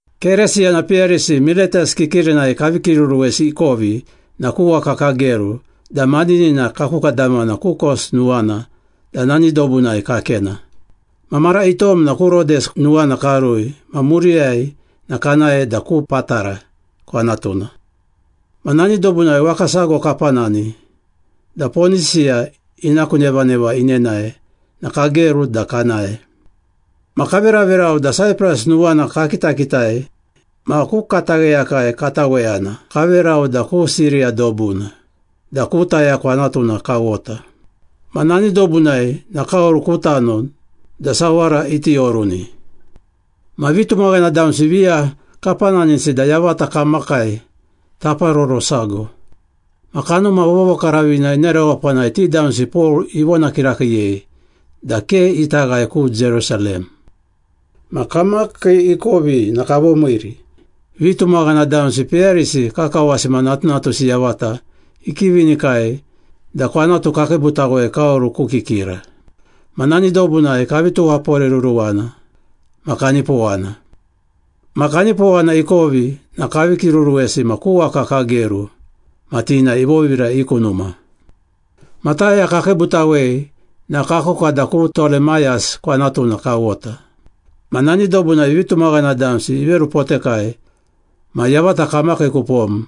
Keresiyana peyarisi Miletas kikirinai kavi kiruruwesi ikovi na ku waka kageru da maninina kakukadamana ku Kos nuwana da nani dobunai kakena. Ma mara itom na ku Rodes nuwana karui ma muriyai na kanae da ku Patara kwanatuna. Ma nani dobunai waka sago kapanani da Ponisiya ina ku nevaneva inenae na kageru da kanae. Ma kaveraverau da Saipras nuwana kakitakitai ma ku katagheyakai kataweyana kaverau da ku Siriya dobuna, da ku Taya kwanatuna kawota. Ma nani dobunai na kaoru ku tano da sawara iti oruni. Ma vitumaghana damsi viya kapananisi da yavata kamakai taparoro sago. Ma Kanuma Vovokaravina ina rewapanai ti damsi Pol ivona kirakiiyei da ke ita ghae ku Jerusalem. Ma kamakii ikovi na kavomiiri. Vitumaghana damsi peyarisi kakawasi ma natunatusi yavata ikivinikai da kwanatu kakiibutawei kaoru ku kikira. Ma nani dobunai kavi tuwaporeruruwana ma kanipowana. Ma kanipowana ikovi na kavi kiruruwesi ma ku waka kageru, ma ti na ivovira i ku numa. Ma Taya kakiibutawei na kakuka da ku Tolemayas kwanatuna kawota. Ma nani dobunai vitumaghana damsi iverupotekai ma yavata kamakii kupom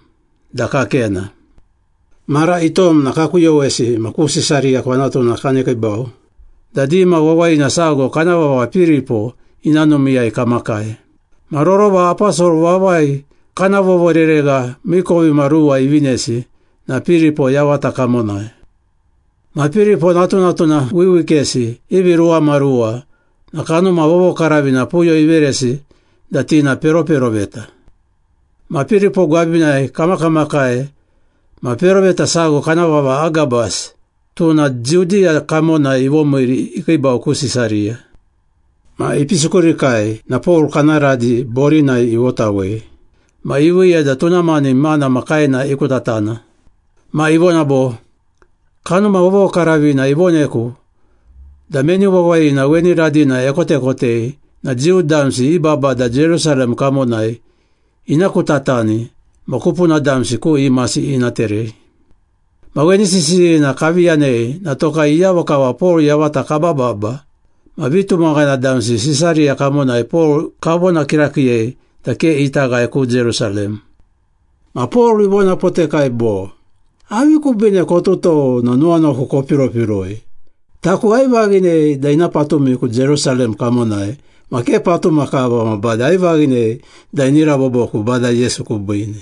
da kakena. Mara itom na kakuyowesi ma ku Sisariya kwanatuna kanekiibau da dima wawayina sago kana vava Piripo ina numiiyai kamakai. Ma rorova aposol vavai kana vovoreregha miikovimaruwa ivinesi na Piripo yavata kamonai. Ma Piripo natunatuna wiwikesi ivi ruwamaruwa na Kanuma Vovokaravina puyo iveresi da ti na peroperoveta. Ma Piripo gwabinai kamakamakai ma peroveta sago kana vava Agabas, tuna Judiya kamonai ivomiiri ikiibau ku Sisariya. Ma ipisi kurikai na Pol kana radi borinai ivotawei ma iviiya da tuna mani imana ma kaena ikutatana. Ma ivona bo, “Kanuma Vovokaravina ivoneku da meni wawayina weni radina ekotekotei na Jiu damsi i babada Jerusalem kamonai ina kutatani ma kupuna damsi ku imasi ina terei.” Ma weni sisiyina kavi yanei na tokai iyavo kava Pol yavata kabababa ma vitumaghana damsi Sisariya kamonai Pol kavona kirakiiyei da ke ita ghae ku Jerusalem. Ma Pol ivonapotekai bo, “Avi kubiine kotutou na nuwanuwaku kopiropiroi? Taku aivaghinei da ina patumiku Jerusalem kamonai ma ke patuma kava ma bade aivaghinei da ini raboboku Bada Yesu kubiine.”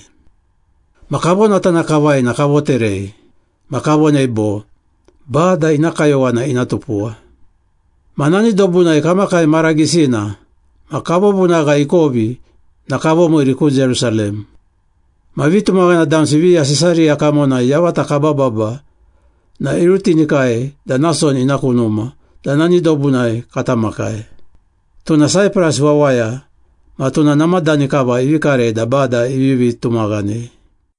Ma kavonatana kavai na kavoterei. Ma kavonei bo, “Bada ina kayowana ina tupuwa.” Ma nani dobunai kamakai mara gisina, ma kavovunagha ikovi na kavomiiri ku Jerusalem. Ma vitumaghana damsi viya Sisariya kamonai yavata kabababa na irutinikai da Nason ina ku numa da nani dobunai kata makai. Tuna Saipras wawaya ma tuna namadani kava ivi karei da Bada ivivi tumaghanei.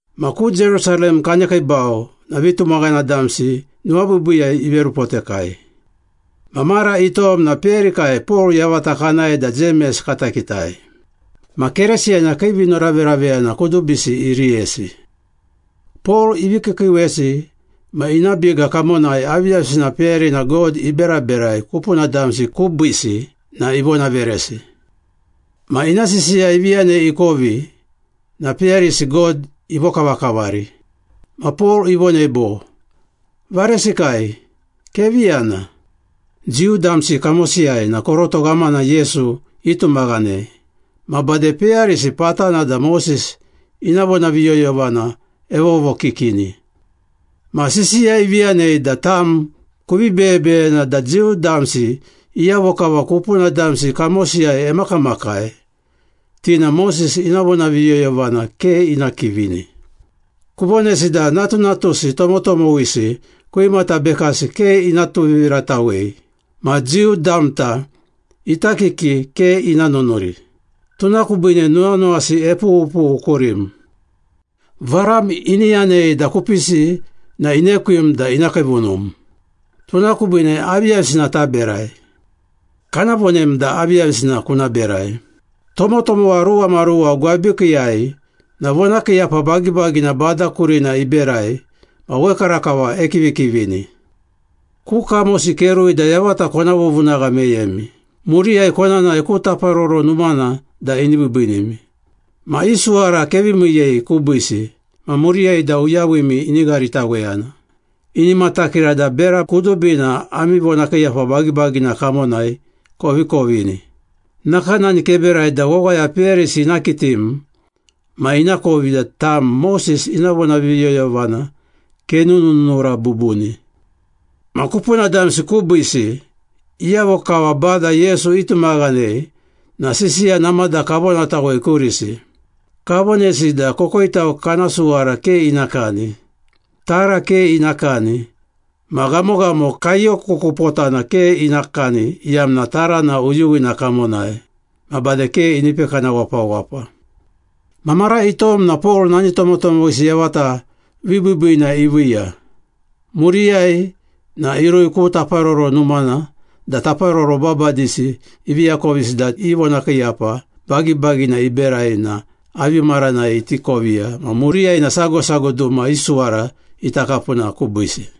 Ma ku Jerusalem kanekiibau na vitumaghana damsi nuwabiibiiyai iverupotekai. Ma mara itom na peyarikai Pol yavata kanae da Jemes kata kitai. Ma Keresiyana kii vinoraveraveyana kudubisi iriyesi. Pol ivi kiikiiwesi ma ina biga kamonai aviyavisina peyarina God iberaberai kupuna damsi kubiisi na ivonaveresi. Ma ina sisiya ivi yanei ikovi, na peyarisi God ivokavakavari. Ma Pol ivonei bo, “Varesikai, kevi yana. Jiu damsi kamosiyai na koroto ghamana Yesu itumaghanei ma bade peyarisi patana da Moses ina vonaviyoyovana evovokikini. Ma sisiya ivi yanei da tam kuvi beyebeyena da Jiu damsi iyavo kava kupuna damsi kamosiyai emakamakai, ti na Moses ina vonaviyoyovana ke ina kivini. Kuvonesi da natunatusi tomotomowisi kwimata bekasi ke ina tuviviratawei ma Jiu damta ita kiki ke ina nunuri. Tuna kubiine nuwanuwasi epughupughu kurim. Varam ini yanei da kupisi na inekwim da ina kiivunum. Tuna kubiine aviyavisina taberai? Kana vonem da aviyavisina kuna berai. Tomotomowa ruwamaruwa gwabikiiyai na vonakiiyapa bagibagina Bada kurina iberai ma wekarakava ekivikivini. Ku kamosi kerui da yavata kona vovunagha meyemi, muriyai kona nae ku Taparoro Numana da ini biibiinimi. Ma i suwara kevi miiyei kubiisi ma muriyai da uyawimi ini gharitaweyana, ini matakira da bera kudubina ami vonakiiyapa bagibagina kamonai kovi kovini. Nakanani keberai da wawaya peyarisi ina kitim ma inakovi da tam Moses ina vonaviyoyovana kenununura bubuni. Ma kupuna damsi kubiisi, iyavo kava Bada Yesu itumaghanei na sisiya namada kavonatawei kurisi. Kavonesi da kokoitau kana suwara ke ina kani, tara ke ina kani, ma ghamoghamo kaiyo kukupotana ke ina kani iyamna tarana uyuwina kamonai, ma bade ke ini pekana wapawapa.” Ma mara itom na Pol nani tomotomowisi yavata vibiibiina iviiya. Muriyai na irui ku Taparoro Numana da taparoro babadisi ivi akovisi da i vonakiiyapa bagibagina iberai na avi maranai iti koviya ma muriyai na sago sago duma i suwara ita kapuna kubiisi.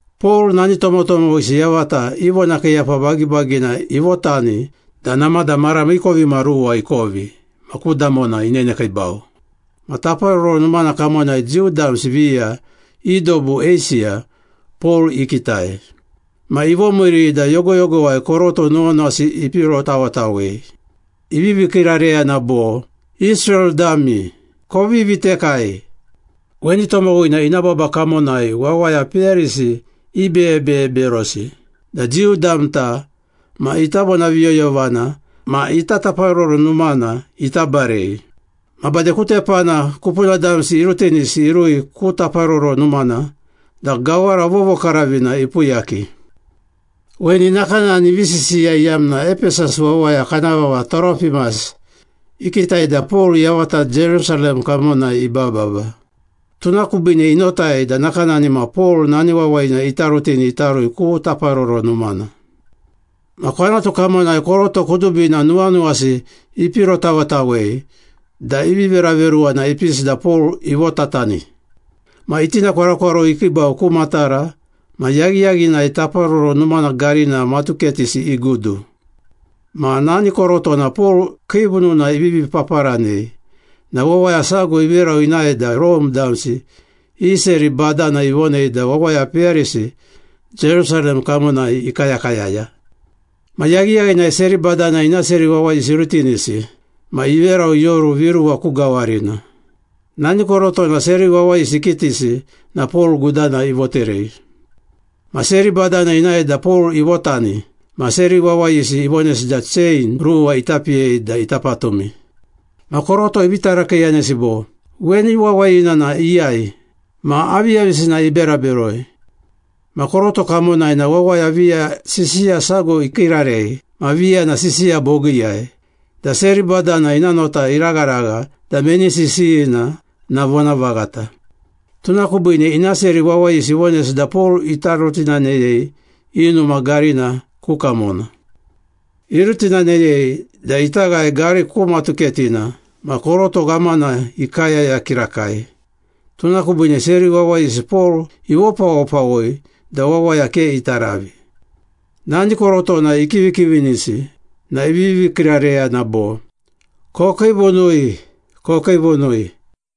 Pol nani tomotomowisi yavata i vonakiiyapa bagibagina ivotani da namada mara miikovimaruwa ikovi ma ku damona inenekiibau. Ma Taparoro Numana kamonai Jiu damsi viya i dobu Eisiya, Pol ikitai. Ma ivomiiri da yogoyogowai koroto nuwanuwasi ipirotawetawei. Ivivi kiirareyana bo, “Israel dami, kovi vitekai! Weni tomowina ina baba kamonai wawaya peyarisi ibeyebeye berosi da Jiu damta ma ita vonaviyoyovana ma ita Taparoro Numana ita barei. Ma bade ku tepana kupuna damsi irutinisi irui ku Taparoro Numana da gawara vovokaravina ipuyaki.” Weni nakanani ivi sisiya iyamna Epesas wawaya kana vava Toropimas, ikitai da Pol yavata Jerusalem kamonai ibababa. Tuna kubiine inotai da nakanani ma Pol nani wawayina ita rutini ita rui ku Taparoro Numana. Ma kwanatu kamonai koroto kudubina nuwanuwasi ipirotawetawei da ivi veraveruwana ipisi da Pol ivotatani. Ma itinakwarokwaroi ikiibau ku matara ma yaghiyaghinai Taparoro Numana garina matuketisi igudu. Ma nani korotona Pol kiivununa ivivi paparanei na wawaya sago iveru inae da Rome damsi i seri badana ivonei da wawaya peyarisi Jerusalem kamonai ikayakayaya. Ma yaghiyaghinai seri badana ina seri wawayisi irutinisi ma iverau ioru viruwa ku gawarina. Nani korotona seri wawayisi ikitisi na Pol gudana ivoterei. Ma seri badana inae da Pol ivotani ma seri wawayisi ivonesi da chein ruwa ita piyei da ita patumi. Ma koroto ivi tarakiiyanesi bo, “Weni wawayina na iyai? Ma aviyavisina ibera beroi?” Ma koroto kamonai na wawaya viya sisiya sago ikiirarei ma viya na sisiya bogiiyai, da seri badana ina nota iragharagha da meni sisiyina na vonavaghata. Tuna kubiine ina seri wawayisi ivonesi da Pol ita rutinaneyei i numa garina ku kamona. Irutinaneyei da ita ghae gari ku matuketina ma koroto ghamana ikayaya kirakai, tuna kubiine seri wawayisi Pol ivopawopawoi da wawaya ke ita ravi. Nani korotona ikivikivinisi na ivivi kiirareyana bo, “Kokiivunui! Kokiivunui!”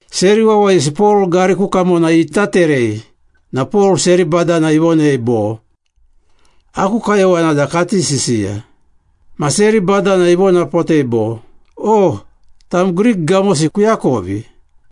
Seri wawayisi Pol gari ku kamona ita terei na Pol seri badana ivonei bo, “Aku kayowana da kati sisiya.” Ma seri badana ivonapotei bo, “O! Tam Grik gamosi kuakovi.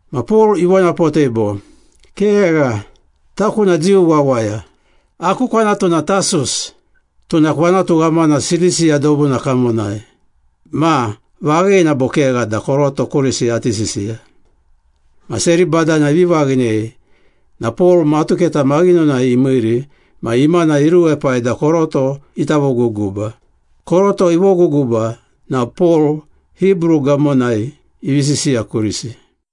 Ma Pol ivonapotei bo, “Kegha. Taku na Jiu wawaya, aku kwanatu na Tasus, tuna kwanatu ghamana Silisiya dobuna kamonai. Ma, vaghina bo kegha da koroto kurisi ati sisiya?” Ma seri badana ivi vaghinei na Pol matuketa maghinonai imiiri ma imana iruepai da koroto ita voguguba. Koroto ivoguguba na Pol Hibru gamonai ivi sisiya kurisi.